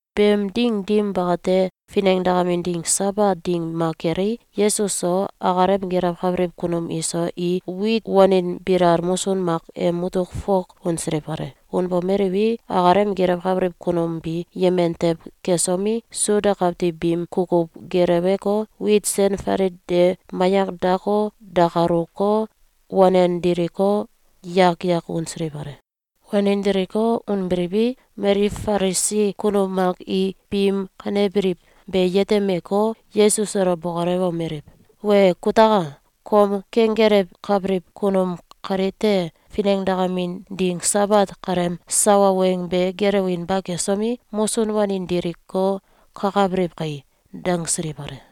Beem ding dim bakate, finengdakamin ding Sabat ding mak kelei, Yesus so akalem gelewkabiliw kunum iso i wit wanin bilal musun mak em mutuk fok unsiliw kale. Unbomeliwi, akalem gelewkabiliw kunum bi yemen tew kesomi, Suda kawtiw biim kukuw geleweko, wit sen falit de mayak dako, dakaluko, wanen diliko, yak yak unsiliw kale. Wanin diliko, unbiliwi, mali Falisi kunum mak i biim kanebiliw be yetemeko, Yesus elo bokolewomeliw: “Wee kutaka! Kom kenggelewkabiliw kunum kalite finengdakamin ding Sabat kaleem sawa weng be gelewinba kesomi, musun wanin diliko, kakabiliw kai!”, dangsiliw kale.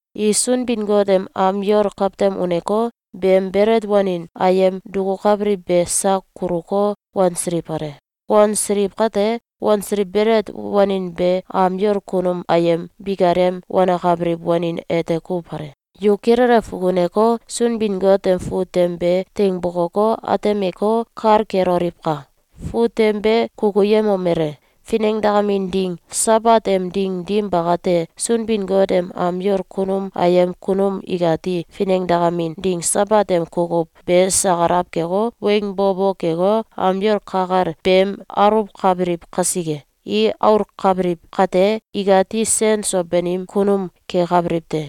i Sunbin-Got em am yol kawtem uneko, beem belet wanin ayem dukukabiliw be sak kuluko, wansiliw kale. Wansiliw kate, wansiliw belet wanin be am yol kunum ayem bikalem wanakabiliw wanin ete kuw kale. Yu kilele fukuneko, Sunbin-Got em fut tem be teing bokoko, atemeko, kal keloliwka! Fut tem be kukuyemomele: Finengdakamin ding Sabat em ding dim bakate, Sunbin-Got em am yol kunum ayem kunum ikati finengdakamin ding Sabat em kukuw be sakalaw keko, weng bo bo keko, am yol ka kel beem aluwkabiliw kasike! I aulkabiliw kate, ikati sen so banim kunum kekabiliw te.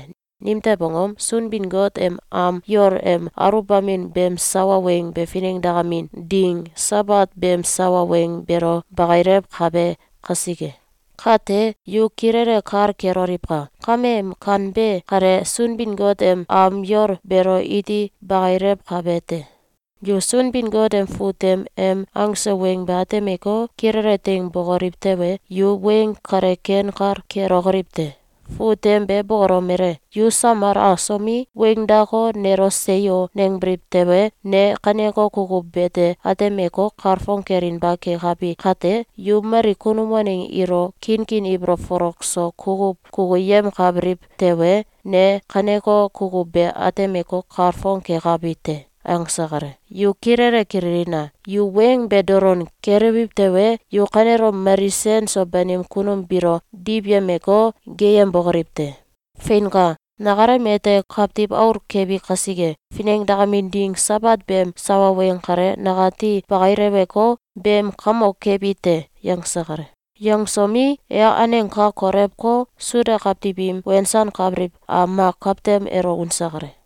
Nimtew angom? Sunbin-Got em am yol em aluwbamin beem sawa weng be finengdakamin ding Sabat beem sawa weng beelo bakilewkabe kasike. Kate yu kilele kal keloliwka! Kame em kanbe kale Sunbin-Got em am yol beelo iti bakilewkabe te. Yu Sunbin-Got em fut tem em angse weng be atemeko, kilele teing bokoliw tewe, yu weng kale ken kal kelokoliw te. Fut tem be bokolomele: ‘Yu samal asomi, weing dako, nelo ‘Seyo!’, nangbiliw tewe, ne kaneko kukuw bete atemeko, kalfong kelinba kekabi kate, yu mali kunum waneng ilo kinkin ibolow folok so kukuw kukuyemkabiliw tewe, ne kaneko kukuw be atemeko, kalfong kekabi te!’, angse kale. Yu kilele kililina! Yu weng be dolon kelewiw tewe, yu kanelom mali sen so banim kunum biilo diwyemeko, geeyembokoliw te! Feinka! Nakalem ete Kawtiw Aul kebi kasike, finengdakamin ding Sabat beem sawa weng kale, nakati bakileweko, beem kamok kebi te.”, yangse kale. Yangsomi, e aneng ka kolewko, Suda kawtiw im wensankabiliw am mak kawtem elo unse kale.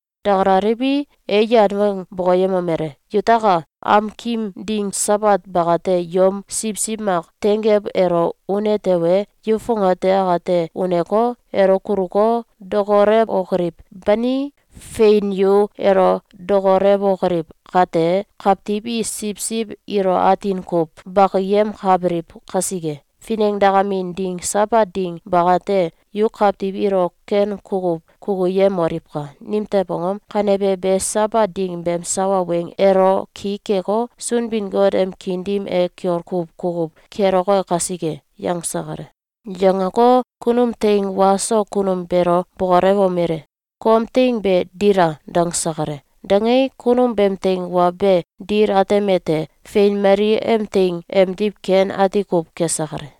Dakalaliwi, e yan weng bokoyemomele: “Yutaka! Amkim ding Sabat bakate, yom siwsiw mak tenggew elo une tewe, yu fongate akate uneko, elo kuluko, dokolewokoliw, bani? Fein, yu elo dokolewokoliw kate, kawtiw i siwsiw ilo atin kuw bakiyemkabiliw kasike, finengdakamin ding Sabat ding bakate, yu kawtiw ilo ken kukuw kukuyemoliwka! Nimtew angom? Kanebe be Sabat ding beem sawa weng elo ki keko, Sunbin-Got em kiin dim e kiol kuw kukuw keloke kasike.”, yangse kale. Yangeko, kunum teing wa so kunum beelo bokolewomele: “Kom teing be dila!”, dangse kale. Dangei, kunum beem teing wa be dil atemete: Fein, mali em teing emdiw ken ati kuw kese kale.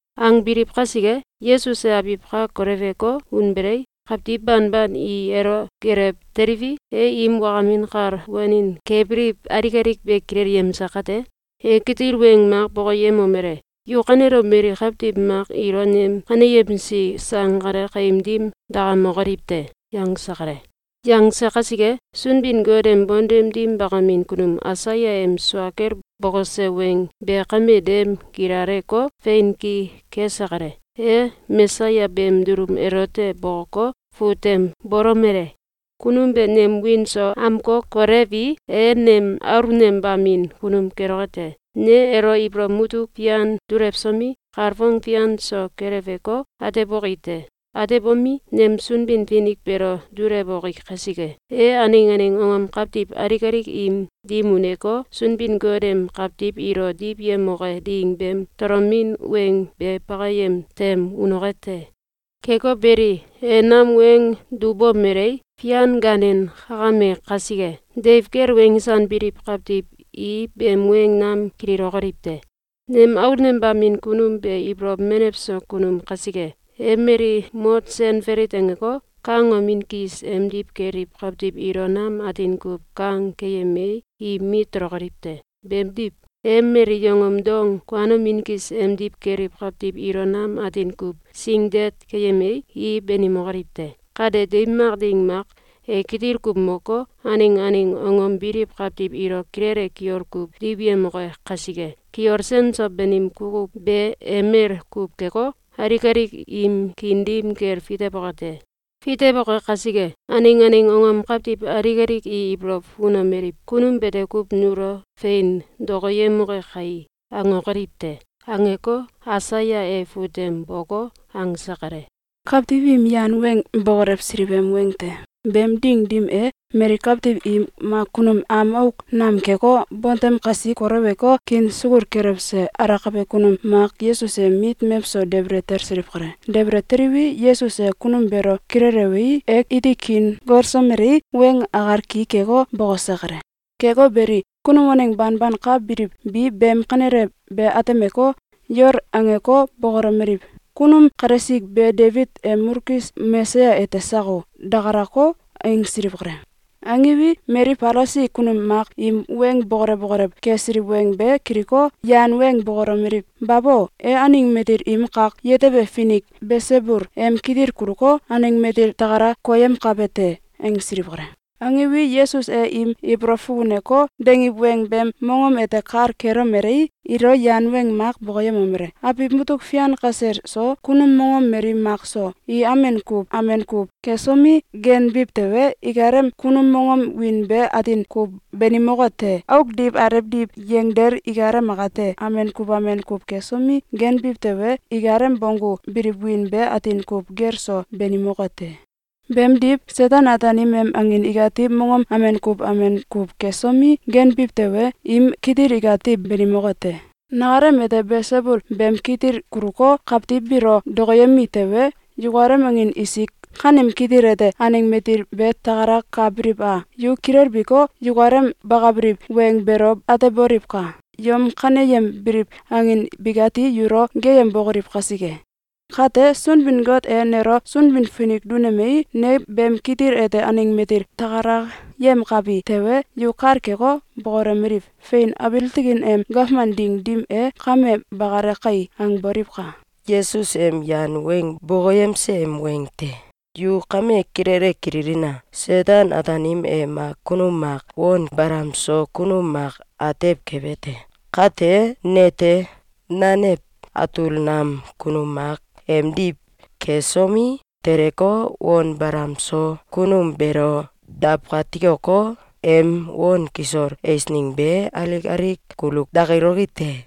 Angbiliw kasike, Yesus e abiw ka koleweko, unbelei, kawtiw banban i elo gelew teliwi, e im wakamin kal wanin kebiliw alik alik be kilelyemse kate, e kitil weng mak bokoyemomele: “Yu kanelom mali kawtiw mak ilo nem kaneyemsi sang kale kaim dim dakamokoliw te!”, yangse kale. Yangse kasike, Sunbin-Got em bontem dim bakamin kunum Aisaya em sua kel bokose weng be kame dem gilaleko, fein ki kese kale. E Mesaya beem dulum elote bokoko, fut tem bolomele: “Kunum be nem wiin so amkokolewii, e nem aulnembamin kunum keloke te. Ne elo ibolow mutuk fian dulewsomi, kalfong fian so keleweko, ateboki te. Atebomi, nem Sunbin-Finik beelo dulewoki kasike, e aneng aneng angom kawtiw alik alik im dim uneko, Sunbin-Got em kawtiw ilo diwyemoke ding beem tolomin weng be bakayem tem unoke te. Keko beli, e nam weng dubomelei, fian gaanem kakame kasike, deiw kel wensanbiliw kawtiw i beem weng nam kililokoliw te. Nem aulnembamin kunum be ibolow menew so kunum kasike, e mali mot sen falit angeko, kangomin kis emdiw keliw kawtiw ilo nam atin kuw kang keyemei, i mit tolokoliw te. Beemdiw, e mali yongom dong kuanomin kis emdiw keliw kawtiw ilo nam atin kuw singdet keyemei, i banimokoliw te. Kate deiw mak ding mak, e kitil kuw moko, aneng aneng angom biliw kawtiw ilo kilele kiol kuw diwyemoke kasike, kiol sen so banim kukuw be emel kuw keko, alik alik im kiin dim kel fitewoke te. Fitewoke kasike, aneng aneng angom kawtiw alik alik i ibolow fukunomeliw: ‘Kunum bete kuw nulo fein dokoyemoke kai!’, angokoliw te.”, angeko, Aisaya e fut tem boko, angse kale. Kawtiw im Yan Weng Bokolewsiliw em Weng te. Beem ding dim e, mali kawtiw i mak kunum am auk nam keko, bontem kasi kolewko, kiin sukul kelewse alakabe kunum mak Yesus em mit mewso debele talsiliw kale. Debele teliwi, Yesus e kunum beelo kilelewei, e iti kiin golsomelei, weng akal ki keko, bokose kale. Keko beli, kunum waneng banban ka biliw bi beem kanele be atemeko, yol angeko, bokolomeliw: “Kunum kalesik be Debit em mulkis Mesaya ete sako?”, dakalako, angsiliw kale. Angiwi, mali Falisi kunum mak im weng bokolew bokolew kesiliw weng be kiliko, yan weng bokolomeliw: “Babo! E aneng matil im kak yetebe finik Belsebul em kitil kuluko, aneng matil takala koyem kebe te!”, angsiliw kale. Angiwi, Yesus e im ibolow fukuneko, dangiw weng beem mongom ete kal kelomelei, ilo yan weng mak bokoyemomele: “Abiw mutuk fian kasel so, kunum mongom mali mak so, i amen kuw amen kuw kesomi, ganbiw tewe, ikalem kunum mongom wiin be atin kuw banimoke te. Auk diw alew diw yangdel ikalem akate amen kuw amen kuw kesomi, ganbiw tewe, ikalem bonggu biliw wiin be atin kuw gel so banimoke te. Beemdiw, Seten-Ataanim em angin ikati mongom amen kuw amen kuw kesomi, ganbiw tewe, im kitil ikati banimoke te. Nakalem ete Belsebul beem kitil kuluko, kawtiw biilo dokoyemi tewe, yukalem angin isik kanem kitil ete aneng matil bi takalakabiliw a? Yu kilelbiko, yukalem bakabiliw weng beelo ateboliwka! Yom kaneyembiliw angin bikati yulo geeyembokoliw kasike! Kate, Sunbin-Got e nelo Sunbin-Finik dunemei, ne beem kitil ete aneng matil takalayemkabi tewe, yu kal keko, bokolomeliw: ‘Fein! Abiil tikin em gawman ding dim e, kame bakale kai!’, angboliwka! Yesus em Yan Weng Bokoyemse em Weng te. Yu kame kilele kililina! Seten-Ataanim e mak kunum mak on balam so kunum mak atew kebe te. Kate nete, nanew atul nam kunum mak emdiw kesomi, teleko, on balam so kunum beelo dawkatikoko, em on kisol eisneng be, alik alik kulu dakiloki te.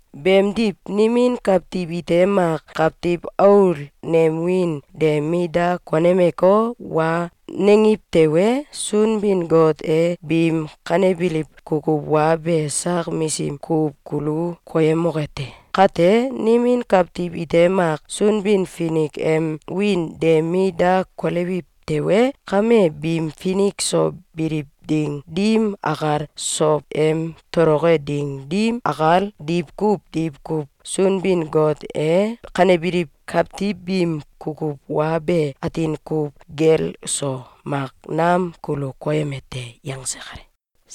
Beemdiw, nimin kawtiw ite mak Kawtiw Aul nem wiin de mit da konemeko, wa nangiw tewe, Sunbin-Got e biim kanebiliw kukuw wa be sak misim kuw kulu koyemoke te. Kate, nimin kawtiw ite mak Sunbin-Finik em wiin de mit da kolewiw tewe, kame biim finik so biliw ding dim akal, sow em toloke ding dim akal, diwkuw diwkuw Sunbin-Got e kanebiliw kawtiw biim kukuw wa be atin kuw gel so mak nam kulu koyeme te.”, yangse kale.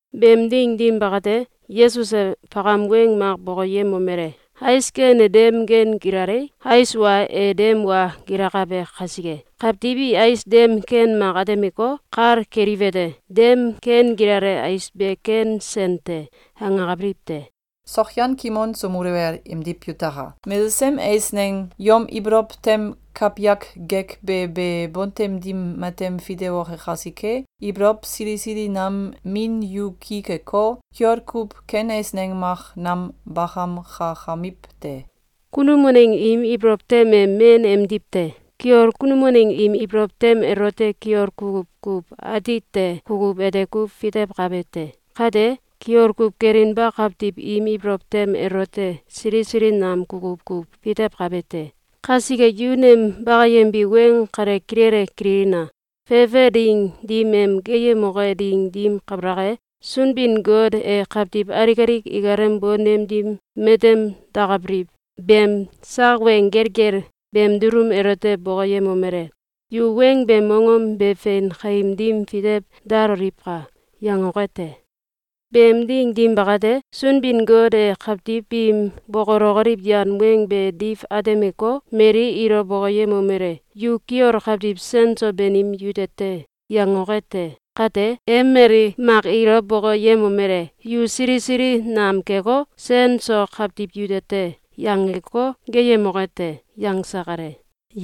Beem ding dim bakate, Yesus e fakam weng mak bokoyemomele: “Ais ken e dem ken gilalei, ais wa e dem wa gilakabe kasike, kawtiw i ais dem ken mak atemeko, kal keliwete: ‘Dem ken gilale ais be ken sen te!’, angakabiliw te. Sokyan kimon so muluwel emdiw yutaka! Mesesem eisneng yom ibolow tem kawyak gekbe be bontem dim matem fitewoke kasike, ibolow sili sili nam min yu ki keko, kiol kuw ken eisneng mak nam bakamkakamiw te. Kunum waneng im ibolow tem e men emdiw te. Kiol kunum waneng im ibolow tem elote kiol kukuw kuw atite kukuw ete kuw fitewkabe te. Kate kiol kuw kelinba kawtiw im ibolow tem elote sili sili nam kukuw kuw fitewkabe te. Kasike yu nem bakayembi weng kale kilele kililina! Fefe ding dim em geeyemoke ding dim kabalak e, Sunbin-Got e kawtiw alik alik ikalem bontem dim matem dakabiliw beem sak weng gelgel beem dulum elote bokoyemomele: ‘Yu weng beem mongom be fein kaim dim fitew daloliwka!’, yangoke te. Beem ding dim bakate, Sunbin-Got e kawtiw biim bokolokoliw yan weng be diw atemeko, mali ilo bokoyemomele: ‘Yu kiol kawtiw sen so banim yute te!’, yangoke te. Kate, e mail mak ilo bokoyemomele: ‘Yu sili sili nam keko, sen so kawtiw yute te!’, yangeko, geeyemok te.”, yangse kale.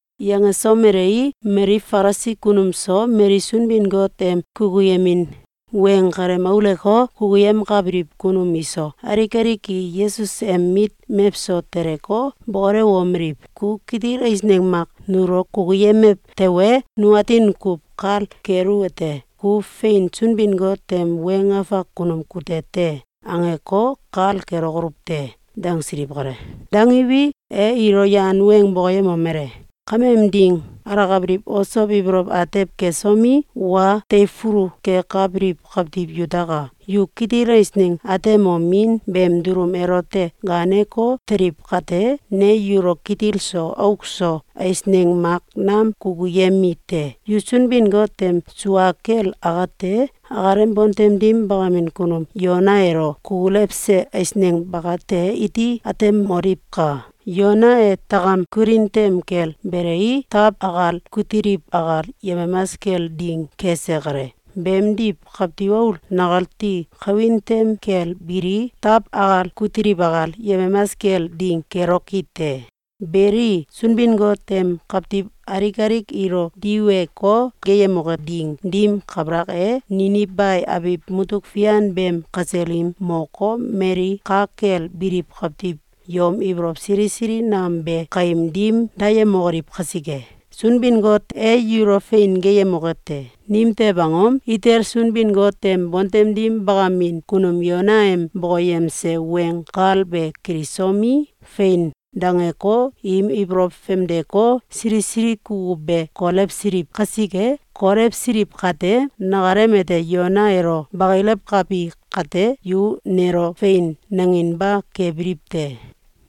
Yangesomelei, mali Falisi kunum so, mali Sunbin-Got em kukuyemin weng kalem aulewko, kukuyemkabiliw kunum iso, alik alik i Yesus em mit mewso teleko, bokolewomeliw: “Ku kitil eisneng mak nulo kukuyemew tewe, nu atin kuw kal keluwete: ‘Ku fein, Sunbin-Got em weng afak kunum kute te!’, angeko, kal kelokoluw te!”, dangsiliw kale. Dangiwi, e ilo yan weng bokoyemomele: “Kameem ding alakabiliw osow ibolow atew kesomi, wa teifulu kekabiliw kawtiw yutaka! Yu kitil eisneng atemomin beem dulum elote gaaneko, teliw kate, ne yulo kitil so auk so eisneng mak nam kukuyemi te. Yu Sunbin-Got em sua kel akate akalem bontem dim bakamin kunum Yona elo kukulewse eisneng bakate iti atemoliwka! Yona e takam kulin tem kel belei, taw akal kutiliw akal yemamas kel ding kese kale. Beemdiw, Kawtiw Aul nakati kawin tem kel bilii, taw akal kutiliw akal yemamas kel ding keloki te. Beli, Sunbin-Got em kawtiw alik alik ilo diweko, geeyemoke ding dim kabalak e, Ninibe abiw mutuk fian beem kasel i moko, mali ka kel biliw kawtiw yom ibolow sili sili nam be kaim dim dayemokoliw kasike, Sunbin-Got e yulo fein geeyemoke te! Nimtew angom? Ite Sunbin-Got em bontem dim bakamin kunum Yona em bokoyemse weng kal be kilisomi, ‘Fein!’, dangeko, im ibolow famdeko, sili sili kukuw be kolewsiliw kasike. Kolewsiliw kate, nakalem ete Yona elo bakilewkabi kate, yu nelo “Fein!”, nanginba kebiliw te.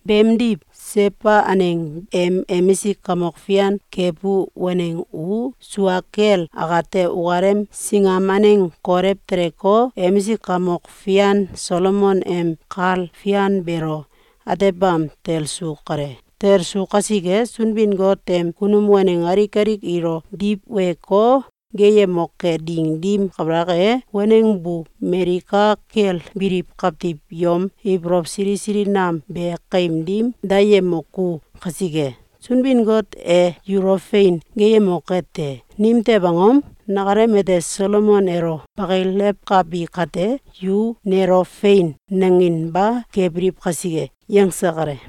Beemdiw, Seba aneng em emisik kamok fian kebu waneng u sua kel akate ukalem singam aneng kolew teleko, emisik kamok fian Solomon em kal fian beelo atebam talsu kale. Talsu kasike, Sunbin-Got em kunum waneng alik alik ilo diweko, geeyemoke ding dim kabalak e, waneng bu mali ka kel biliw kawtiw yom ibolow sili sili nam be kaim dim dayemoku kasike, Sunbin-Got e yulo fein geeyemoke te. Nimtew angom? Nakalem ete Solomon elo bakilewkabi kate, yu nelo ‘Fein!’, nanginba kebiliw kasike.”, yangse kale.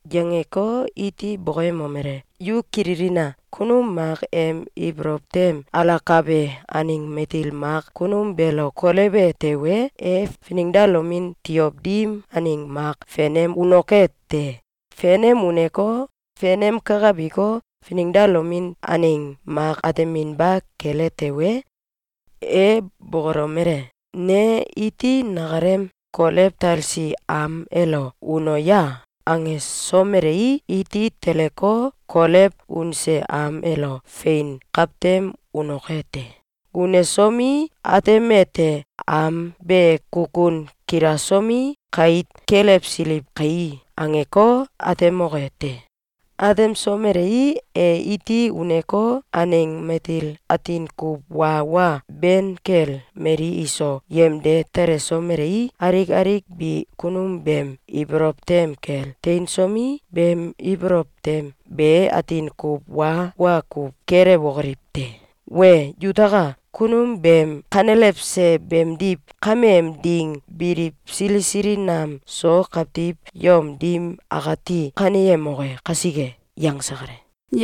Yangeko, iti bokoyemomele: “Yu kililina! Kunum mak em ibolow tem alakabe aneng matil mak kunum beelo kolewe tewe, e finengdalomin tiow dim aneng mak fenem unoke te. Fenem uneko, fenem kakabiko, finengdalomin aneng mak ateminba kele tewe, e bokolomele: ‘Ne iti nakalem kolew talesi am elo uno ya!’, angesomelei, iti teleko, kolew unse am elo fein kawtem unoke te. Unesomi, atemete: ‘Am be kukun kilasomi, kait kelewsiliw kai!’, angeko, atemoke te. Atemsomelei, e iti uneko, aneng matil atin kuw wa wa ben kel mali iso yemde telesomelei, alik alik bi kunum beem ibolow tem kel teinsomi, beem ibolow tem be atin kuw wa wa kuw kelewokoliw te. Wee yutaka! Kunum beem kanelewse beemdiw kameem ding biliw sili sili nam so kawtiw yom dim akati kaneyemoke kasike.”, yangse kale.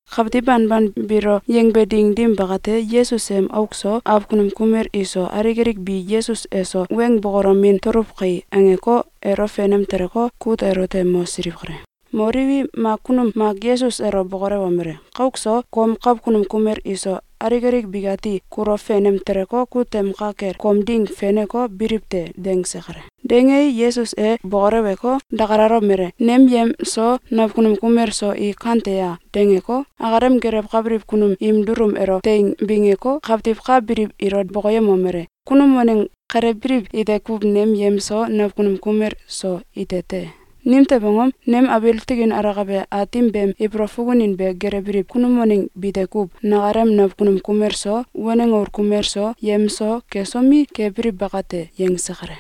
Kawtiw banban biilo yangbe ding dim bakate, Yesus em auk so, awkunum kumel iso, alik alik bi “Yesus eso weng bokolomin tuluw kai!”, angeko, elo fenem teleko, kut elote mosiliw kale. Moliwi, mak kunum mak Yesus elo bokolewomele: “Kauk so, kom kawkunum kumel iso, alik alik bikati kulo fenem teleko, kut tem ka kel kom ding feneko, biliw te.”, dangse kale. Dangei, Yesus e bokoleweko, dakalalomele: “Nem yem so, nawkunum kumel so i kante a?”, dangeko, akalem gelewkabiliw kunum im dulum elo teing bingeko, kawtiw ka biliw ilo bokoyemomele: “Kunum waneng kale biliw ite kuw nem yem so, nawkunum kumel so, ite te. Nimtew angom? Nem abiil tikin alakabe Aatim beem ibolow fukunin be gelewbiliw kunum waneng bite kuw nakalem nawkunum kumel so, waneng aul kumel so, yem so, kesomi, kebiliw bakate.”, yangse kale.